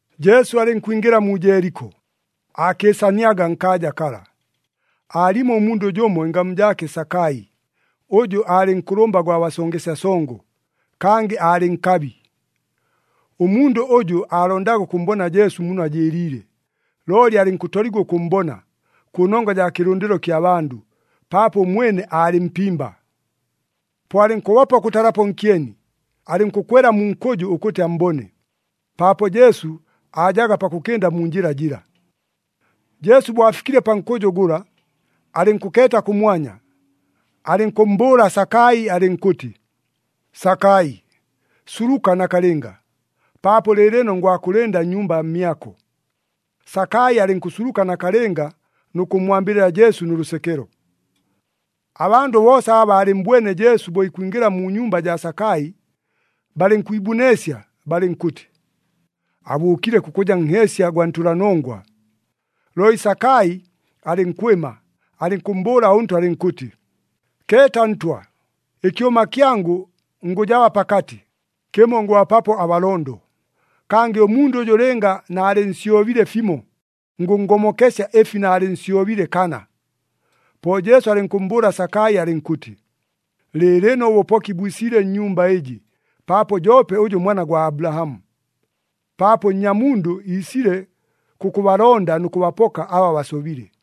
Jesu alɨnkwingɨla mu Jeeliko, aakɨɨsaniaga nkaaja kala. Aalimo ʉmundʉ jʉmo ɨngamu jaake Sakai, ʉjʉ aalɨ nkʉlʉmba gwa basongesya songo, kangɨ aalɨ nkabi. Ʉmundʉ ʉjʉ aalondaga ʉkʉmmbona Jesu muno ajɨɨliile, looli alɨnkʉtoligwa ʉkʉmmbona, kʉnongwa jaa kɨlʉndɨlo kya bandʉ, paapo ʉmwene aalɨ mpimba. Po alɨnkʉbopa ʉkʉtalapo nkyeni, alɨnkʉkwela mu nkʉjʉ ʉkʉtɨ ammbone, paapo Jesu aajaga pakʉkɨnda mu njɨla jɨla. Jesu bo afikile pa nkʉjʉ gʉla, alɨnkʉkeeta kʉmwanya, alɨnkʉmmbʉʉla Sakai alɨnkʉtɨ, “Sakai, suluka nakalɨnga! Paapo lɨɨlɨno ngwakʉlɨnda nnyumba mmyako.” Sakai alɨnkʉsuluka nakalɨnga nʉ kʉmmwambɨlɨla Jesu nʉ lʉsekelo. Abandʉ boosa aba baalɨmmbwene Jesu bo ikwingɨla mu nyumba jaa Sakai, balɨnkwibuneesya, balɨnkʉtɨ, “Abʉʉkile kʉkʉja nheesya gwa ntʉlanongwa!” Looli Sakai alɨnkwɨma, alɨnkʉmmbʉʉla ʉNtwa alɨnkʉtɨ, “Keeta Ntwa! Ɨkyʉma kyangʉ ngʉjaba pakatɨ, kɨmo ngʉbapapo abalondo. Kangɨ ʉmundʉ ʉjʉ lɨnga naalɨnsyobile fimo, ngʉnngomokesya ɨfi naalɨnsyobile kana.” Po Jesu alɨnkʉmmbʉʉla Sakai alɨnkʉtɨ, “Lɨɨlɨno ʉbʉpoki bwisile nnyumba ɨjɨ, paapo joope ʉjʉ mwana gwa Abulahamu. Paapo Nnyamundʉ iisile kʉkʉbalonda nʉ kʉbapoka aba basobile.”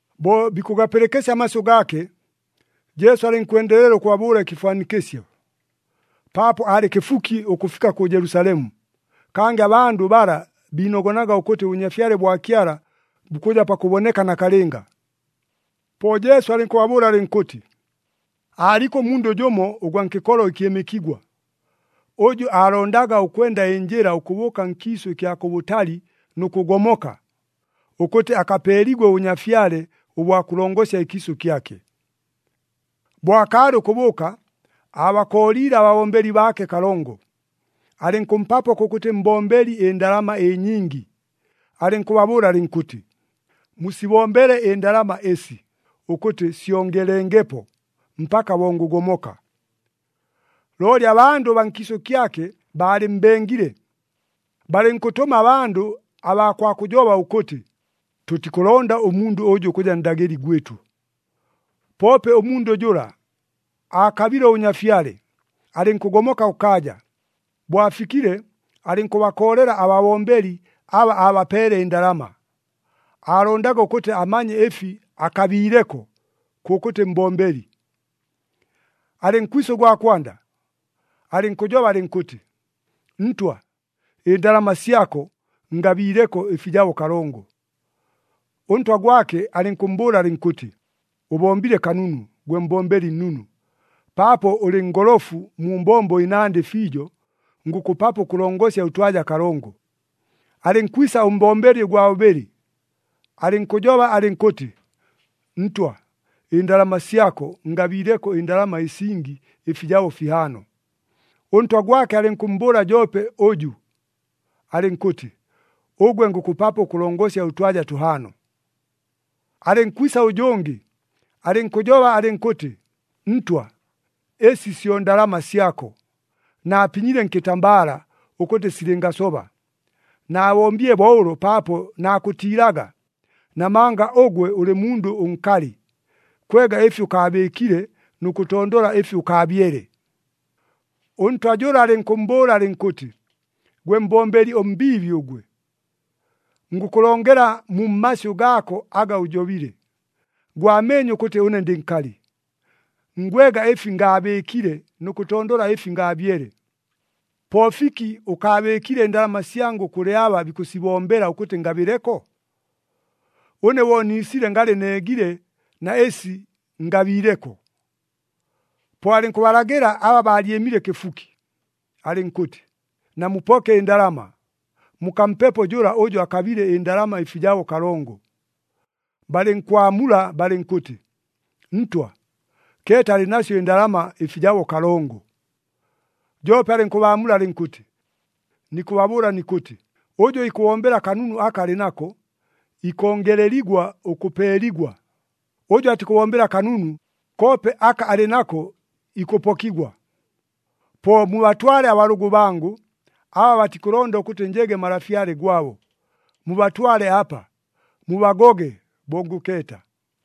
Bo bikʉgapɨlɨkɨsya amasyʉ gaake, Jesu alɨnkwendelela ʉkʉbabʉʉla ɨkɨfwanikɨsyo, paapo aalɨ kɨfuki ʉkʉfika kʉ Jelusalemu, kangɨ abandʉ bala biinogonaga ʉkʉtɨ ʉBʉnyafyale bwa Kyala bukʉja pakʉboneka nakalɨnga. Po Jesu alɨnkʉbabʉʉla alɨnkʉtɨ, “Aaliko ʉmundʉ jʉmo ʉgwa nkɨkolo ɨkyɨmɨkigwa, ʉjʉ aalondaga ʉkwenda ɨnjɨla ʉkʉbʉʉka nkiisʉ ɨkya kʉbʉtali nʉ kʉgomoka, ʉkʉtɨ akapeeligwe ʉbʉnyafyale ʉbwa kʉlongosya ɨkiisʉ kyake. “Bo akaalɨ ʉkʉbʉʉka, aabakooliile ababombeli baake kalongo, alɨnkʉmpapo kʉkʉtɨ mbombeli ɨndalama ɨnyingi, alɨnkʉbabʉʉla alɨnkʉtɨ, ‘Musibombele ɨndalama ɨsi, ʉkʉtɨ syongelengepo, mpaka bo ngʉgomoka.’ Looli abandʉ baa nkiisʉ kyake baalɨmmbengile, balɨnkʉtʉma abandʉ abaa kwa kʉjoba ʉkʉtɨ, ‘Tʉtikʉlonda ʉmundʉ ʉjʉ ʉkʉja ndagɨli gwɨtʉ!’ Poope ʉmundʉ jʉla aakabile ʉbʉnyafyale, alɨnkʉgomoka kʉkaaja. Bo afikile alɨnkʉbakoolela ababombeli aba aabapeele ɨndalama, aalondaga ʉkʉtɨ amanye ɨfi akabiileko kʉkʉtɨ mbombeli. “Alɨnkwisa ʉgwa kwanda, alɨnkʉjoba alɨnkʉtɨ, ‘Ntwa, ɨndalama syako, ngabiileko ɨfijabo kalongo.’ Ʉntwa gwake alɨnkʉmmbʉʉla alɨnkʉtɨ, ‘Ʉbombile kanunu, gwe mbombeli nnunu! Paapo ʉlɨ ngolofu mu mbombo ɨnandɨ fiijo, ngʉkʉpapo ʉkʉlongosya ʉtwaja kalongo.’ Alɨnkwisa ʉmbombeli ʉgwa bʉbɨlɨ alɨnkʉjoba alɨnkʉtɨ, ‘Ntwa, ɨndalama syako, ngabiileko ɨndalama ɨsingi ɨfijabo fihaano.’ Ʉntwa gwake alɨnkʉmmbʉʉla joope ʉjʉ, alɨnkʉtɨ, ‘Ʉgwe, ngʉkʉpapo ʉkʉlongosya ʉtwaja tʉhaano.’ “Alɨnkwisa ʉjʉngɨ alɨnkʉjoba alɨnkʉtɨ, ‘Ntwa, ɨsi syo ndalama syako, naapinyile nkɨtambala, ʉkʉtɨ silɨngasoba. Naabombile bo ʉlo paapo nakʉtiilaga, namanga ʉgwe ʉlɨ mundʉ ʉnkalɨ. Kwega ɨfi ʉkaabɨɨkile nʉ kʉtondola ɨfi ʉkaabyele.’ “Ʉntwa jʉla alɨnkʉmmbʉʉla alɨnkʉtɨ, ‘Gwe mbombeli ʉmbiibi ʉgwe! Ngʉkʉlongela mu mmasyʉ gaako aga ʉjobile. Gwameenye ʉkʉtɨ ʉne ndɨ nkalɨ. Ngwega ɨfi ngaabɨɨkile nʉ kʉtondola ɨfi ngaabyele. Po fiki ʉkaabɨɨkile ɨndalama syangʉ kʉlɨ aba bikʉsibombela ʉkʉtɨ ngabɨleko? Ʉne bo niisile ngalɨ neegile na ɨsi ngabiileko.’ “Po alɨnkʉbalagɨla aba baalyɨmile kɨfuki, alɨnkʉtɨ, ‘Namupoke ɨndalama, mukampepo jʉla ʉjʉ akabile ndalama ɨfijabo kalongo.’ Balɨnkwamula balɨnkʉtɨ, ‘Ntwa, keeta alɨ nasyo ɨndalama ɨfijabo kalongo!’ “Joope alɨnkʉbaamula alɨnkʉtɨ, ‘Nikʉbabʉʉla nikʉtɨ, ʉjʉ ikʉbombela kanunu aka alɨ nako, ikongeleligwa ʉkʉpeeligwa. Ʉjʉ atikʉbombela kanunu, koope aka alɨ nako ikʉpokigwa. Po mubatwale abalʉgʉ bangʉ, aba batikʉlonda ʉkʉtɨ njege malafyale gwabo, mubatwale apa, mubagoge, bo ngʉkeeta!’”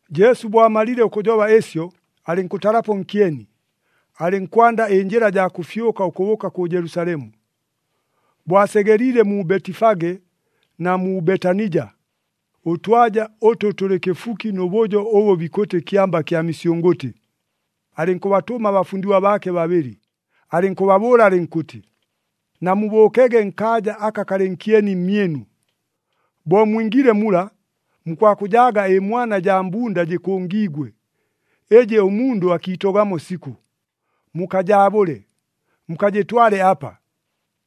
Jesu bo amalile ʉkʉjoba ɨsyo alɨnkʉtalapo nkyeni, alɨnkwanda ɨnjɨla jaa kʉfyʉka ʉkʉbʉʉka kʉ Jelusalemu. Bo asegeliile mu Betifage na mu Betanija, ʉtwaja ʉtʉ tʉlɨ kɨfuki nʉ bʉjo ʉbʉ bikʉtɨ Kyamba kya Misyʉngʉtɨ, alɨnkʉbatʉma abafundigwa baake babɨlɨ, alɨnkʉbabʉʉla alɨnkʉtɨ, “Namubʉʉkege nkaaja aka kalɨ nkyeni mmyɨnu. Bo mwingiile mula, mukwakʉjaaga ɨmwana jaa mbunda jɨkʉngiigwe, ɨjɨ ʉmundʉ akiitogamo sikʉ. Mukajaabʉle, mukajɨtwale apa.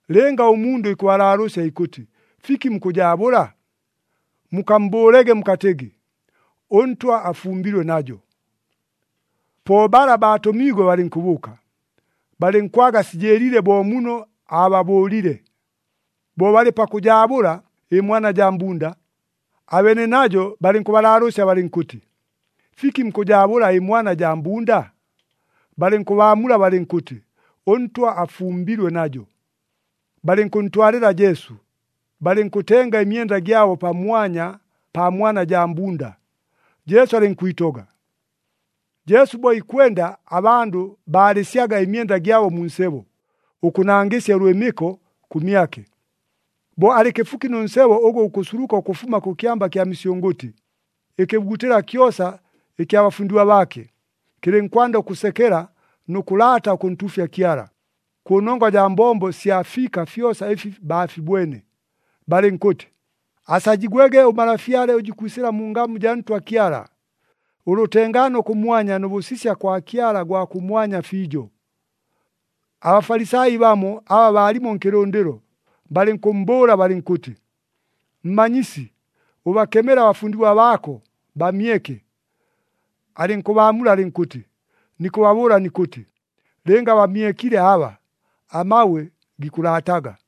Lɨnga ʉmundʉ ikʉbalaalʉʉsya ikʉtɨ, ‘Fiki mukʉjaabʉla?’ mukammbʉʉlege mukatɨgɨ, ‘ɄNtwa afumbilwe najo.’” Po bala baatʉmiigwe balɨnkʉbʉʉka, balɨnkwaga sijɨɨliile bo muno aababʉʉlile. Bo balɨ pakʉjaabʉla ɨmwana jaa mbunda, abeene najo balɨnkʉbalaalʉʉsya balɨnkʉtɨ, “Fiki mukʉjaabʉla ɨmwana jaa mbunda?” Balɨnkʉbaamula balɨnkʉtɨ, “ɄNtwa afumbilwe najo.” Balɨnkʉntwalɨla Jesu, balɨnkʉtenga ɨmyenda gyabo pamwanya paa mwana jaa mbunda, Jesu alɨnkwitoga. Jesu bo ikwenda, abandʉ baalɨsyaga ɨmyenda gyabo mu nsebo, ʉkʉnangɨsya ʉlwɨmɨko kʉmyake. Bo alɨ kɨfuki nʉ nsebo ʉgʉ gukʉsuluka ʉkʉfuma kʉ Kyamba kya Misyʉngʉtɨ, ɨkɨbugutɨla kyosa ɨkya bafundigwa baake, kɨlɨnkwanda ʉkʉsekela nʉ kʉlaata ʉkʉntuufya Kyala, kʉnongwa jaa mbombo sya fiika fyosa ɨfi baafibwene, balɨnkʉtɨ, “Asajigwege ʉMalafyale ʉjʉ ikwisɨla mu ngamu jaa Ntwa Kyala! Ʉlʉtengaano kʉmwanya nʉ bʉsisya kwa Kyala gwa kʉmwanya fiijo!” ABafalisai bamo, aba baalimo nkɨlʉndɨlo, balɨnkʉmmbʉʉla balɨnkʉtɨ, “Mmanyisi, ʉbakemele abafundigwa baako, bamyeke!” Alɨnkʉbaamula alɨnkʉtɨ, “Nikʉbabʉʉla nikʉtɨ, lɨnga bamyekile aba, amabwe gikʉlaataga!”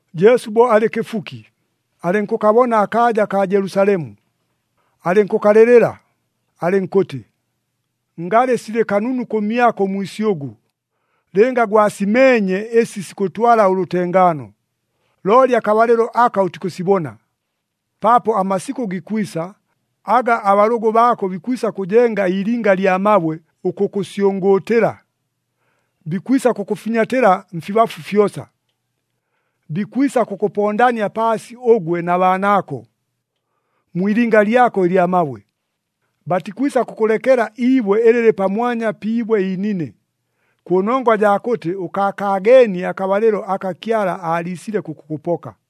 Jesu bo alɨ kɨfuki, alɨnkʉkabona akaaja kaa Jelusalemu, alɨnkʉkalɨlɨla, alɨnkʉtɨ, “Ngalɨ silɨ kanunu kʉmyako ʉmwisyʉgʉ, lɨnga gwasimeenye ɨsi sikʉtwala ʉlʉtengaano! Looli akabalɨlo aka ʉtikʉsibona. Paapo amasikʉ gikwisa, aga abalʉgʉ baako bikwisa kʉjenga iilinga ɨlya mabwe ʉkʉkʉsyʉngʉʉtɨla, bikwisa kʉkʉfinyatɨla mfibafu fyosa. Bikwisa kʉkʉpondania paasi ʉgwe na baanaako, mwi ilinga lyako ɨlya mabwe. Batikwisa kʉkʉlekela iibwe ɨlɨ lɨlɨ pamwanya pi ibwe iinine, kʉnongwa jaa kʉtɨ ʉkaakaageenie akabalɨlo aka Kyala aaliisile kʉkʉkʉpoka!”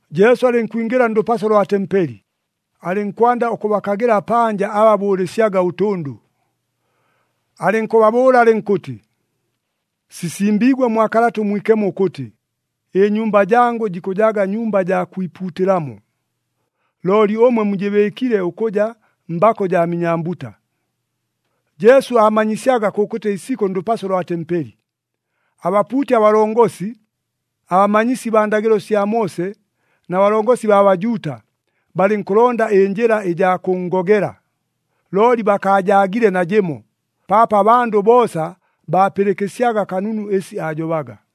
Jesu alɨnkwingɨla ndʉpaso lwa tempeli, alɨnkwanda ʉkʉbakagɨla panja aba bʉʉlɨsyaga ʉtʉndʉ. Alɨnkʉbabʉʉla alɨnkʉtɨ, “Sisimbiigwe mwa Kalata ʉMwikemo ʉkʉtɨ, ‘Ɨnyumba jangʉ jikʉjaga nyumba jaa kwipuutɨlamo.’ Looli ʉmwe, mujɨbɨɨkile ʉkʉja, ‘Mbako jaa minyambuta.’” Jesu aamanyisyaga kʉkʉtɨ isikʉ ndʉpaso lwa tempeli. Abapuuti abalongosi, abamanyisi baa ndagɨlo sya Moose na balongosi baa Bajuuta, balɨnkʉlonda ɨnjɨla ɨjaa kʉnngogela, looli bakaajaagile najɨmo, paapo abandʉ boosa baapɨlɨkɨsyaga kanunu ɨsi aajobaga.